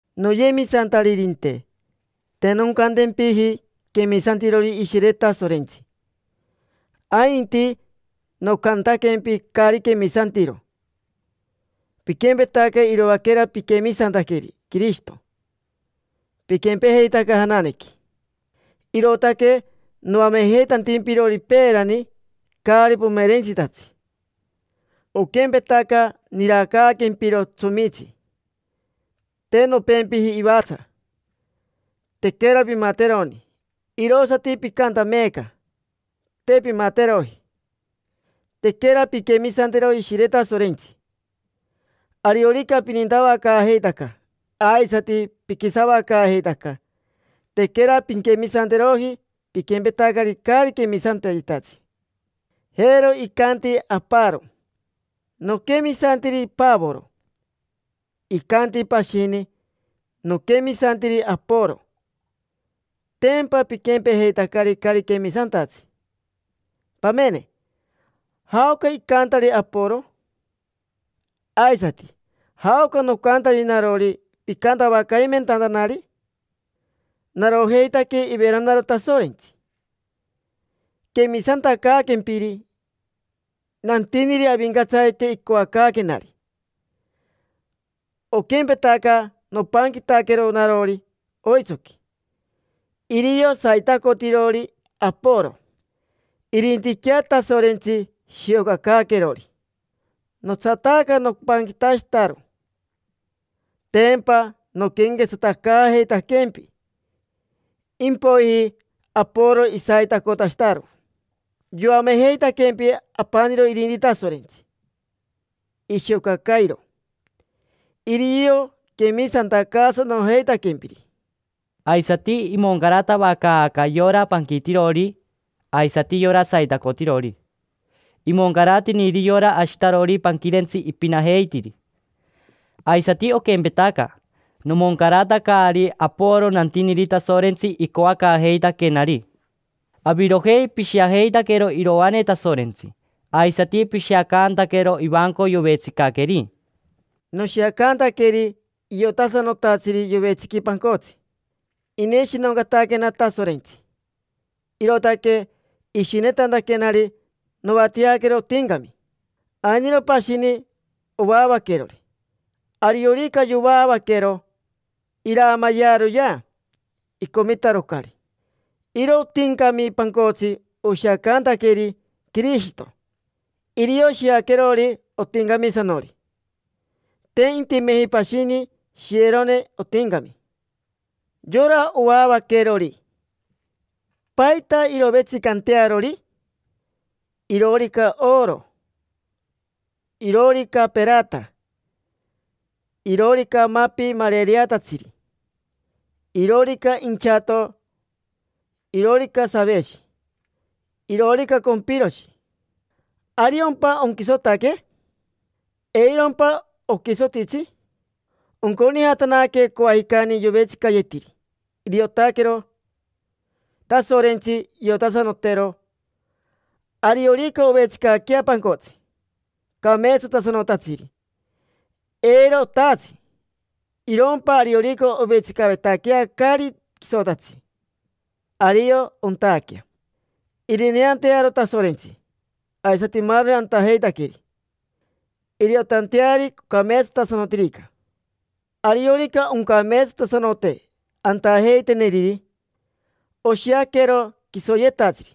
Noyemisantaririnte, te noncantempiji quemisantirori Ishire Tasorentsi, ainti nocantaquempi caari quemisantiro. Piquempetaca iroaquera piquemisantaqueri Quirishito, piquempejeitaca jananequi. Irootaque noamejeitantimpirori peerani caari pomerentsitatsi: oquempetaca niraacaaquempiro tsomitsi; te nompempiji ivatsa, tequera pimateroni. Irosati picanta meeca, te pimateroji. Tequera pinquemisanteroji Ishire Tasorentsi. Ariorica pininatavacaajeitaca, aisati piquisavacaajeitaca, tequera pinquemisanteroji. Piquempetacari caari quemisantayetatsi. Jero icanti aparo: “Noquemisantiri Pavoro”. Icanti pashini: “Noquemisantiri Aporo”. Tempa piquempejeitari caari quemisantatsi. Pamene, ¿jaoca icantari Aporo? Aisati ¿jaoca nocantari narori picantavacaimentantanari? Narojeitaque iveranaro Tasorentsi, quemisantacaaquempiri. Nantiniri Avincatsarite icoacaaquenari. Oquempetaca nopanquitaquero narori oitsoqui. Irio saitacotirori Aporo. Irintiquea Tasorentsi shiocacaaquerori. Notsataaca nopanquitashitaro: tempa noquenquetsatacaajeitaquempi. Impoiji Aporo isaitacotashitaro: yoamejeitaquempi. Apaniro irinti Tasorentsi ishiocacairo: irio quemisantacaasanojeitaquempiri. Aisati imoncaratavacaaca yora panquitirori aisati yora saitacotirori. Imoncaratiniri yora ashitarori panquirentsi ipinajeitiri. Aisati oquempetaca, nomoncaratacari Aporo nantiniri Tasorentsi icoacaajeitaquenari. Avirojei pishiajeitaquero iroane Tasorentsi. Aisati pishiacantaquero ivanco yovetsicaqueri. Noshiacantaqueri iotasanotatsiri yovetsiqui pancotsi. Ineshinoncataquena Tasorentsi, irootaque ishinetantaquenari noatiaquero otincami. Ainiro pashini, ovaavaquerori. Ariorica yovaavaquero, iraamayearoyea, icomitarocari. Iro otincami pancotsi oshiacantaqueri Quirishito, irio shiaquerori otincamisanori. Te intimeji pashini shiyerone otincami. Yora ovaavaquerori, ¿paita irovetsicantearori? Iroorica oro, iroorica perata, iroorica mapi marereatatsiri; iroorica inchato, iroorica saveshi, iroorica compiroshi. ¿Ariompa onquisotaque? ¿Eirompa oquisotitsi? Onconijatanaque coajicani yovetsicayetiri. Iriotaquero Tasorentsi, iriotasanotero. Ariorica ovetsicaquea pancotsi cameetsatasanotatsiri, eiro otaatsi; irompa ariorica ovetsicavetaquea caari quisotatsi, ario ontaaquea. Irineantearo Tasorentsi aisati maaroni antajeitaqueri, iriotanteari ocameetsatasanotirica. Ariorica oncameetsatasanote antajeiteneriri, oshiaquero quisoyetatsiri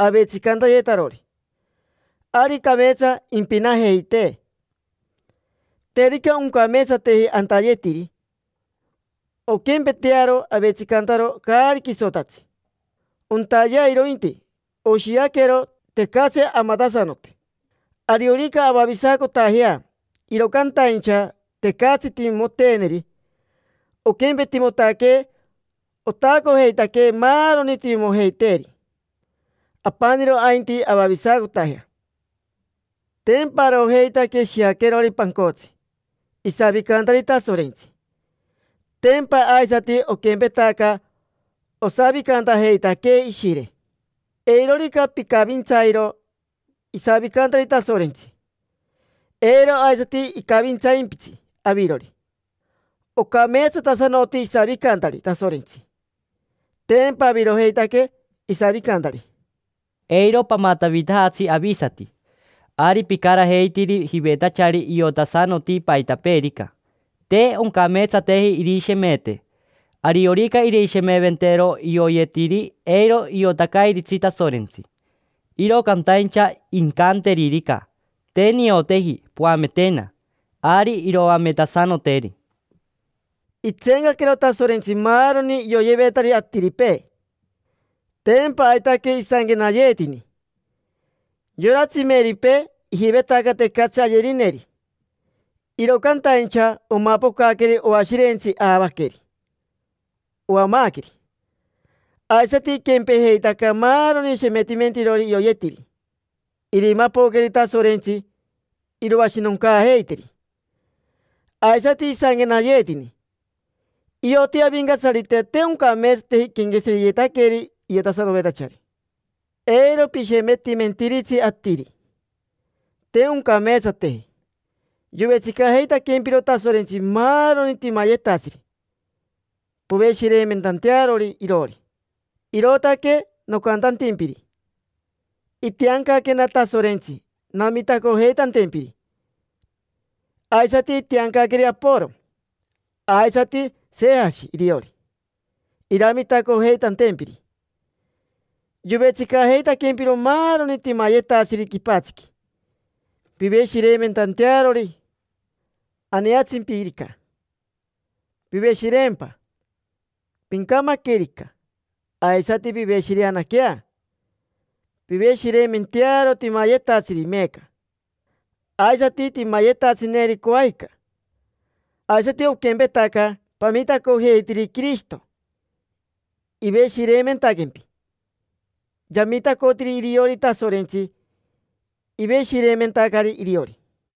avetsicantayetarori; ari cameetsa impinajeitee. Terica oncameetsateji antayeteri, onquempetearo avetsicantaro caari quisotatsi; ontayea irointi, oshiaquero tecatsi amatasanote. Ariorica avavisacotajea, iro cantaincha tecatsi timimoteeneri, onquempetimotaquee otaacojeitaque maaroni timimojeiteeri: apaniro ainti avavisacotajea. Tempa arojeitaque shiaquerori pancotsi isavicantari Tasorentsi. Tempa aisati oquempetaca osavicantajeitaquee Ishire. Eirorica picavintsairo isavicantari Tasorentsi, eiro aisati icavintsaimpitsi avirori. Ocameetsatasanoti isavicantari Tasorentsi: tempa avirojeitaque isavicantari. Eiro pamatavitajatsi avisati. Ari picarajeitiri jivetachari iotasanoti paitapeerica. Te oncameetsateji irishemete. Ariorica irishemeventero ioyetiri, eiro iotacairitsi Tasorentsi. Iro cantaincha incanteririca: “Te nioteji, poametena”, ari iroametasanoteri. Itseencaquero Tasorentsi maaroni ioyevetari atiripee. Tempa aitaque isanquenayeetini: “Yora tsimeripee ijivetaca tecatsi ayerineri, iro cantaincha omapocaqueri oashirentsi aavaqueri, oamaaqueri. Aisati iquempejeitaca maaroni shemetimentarori ioyetiri: irimapoqueri Tasorentsi, iroashinoncaajeiteri”. Aisati isanquenayeetini: “Ioti Avincatsarite te oncameetsateji iquenqueshireyetaqueri iotasanovetachari”. Eiro pishemetimentiritsi atiri, te oncameetsateji. Yovetsicajeitaquempiro Tasorentsi maaroni timayetatsiri poveshireimentantearori iroori. Irootaque nocantantimpiri: itiancaquena Tasorentsi namitacojeitantempiri, aisati itiancaqueri Aporo, aisati Sejashi iriori, iramitacojeitantempiri. Yovetsicajeitaquempiro maaroni timayetatsiri quipatsiqui, piveshireimentantearori. Aneatsimpirica, piveshireempa. Pincamaquerica, aisati piveshireanaquea. Piveshireimentearo timayetatsiri meeca, aisati timayetatsineri coajica. Aisati oquempetaca, pamitacojeitiri Quirishito, iveshireimentaquempi. Yamitacotiri iriori Tasorentsi, iveshireimentacari iriori.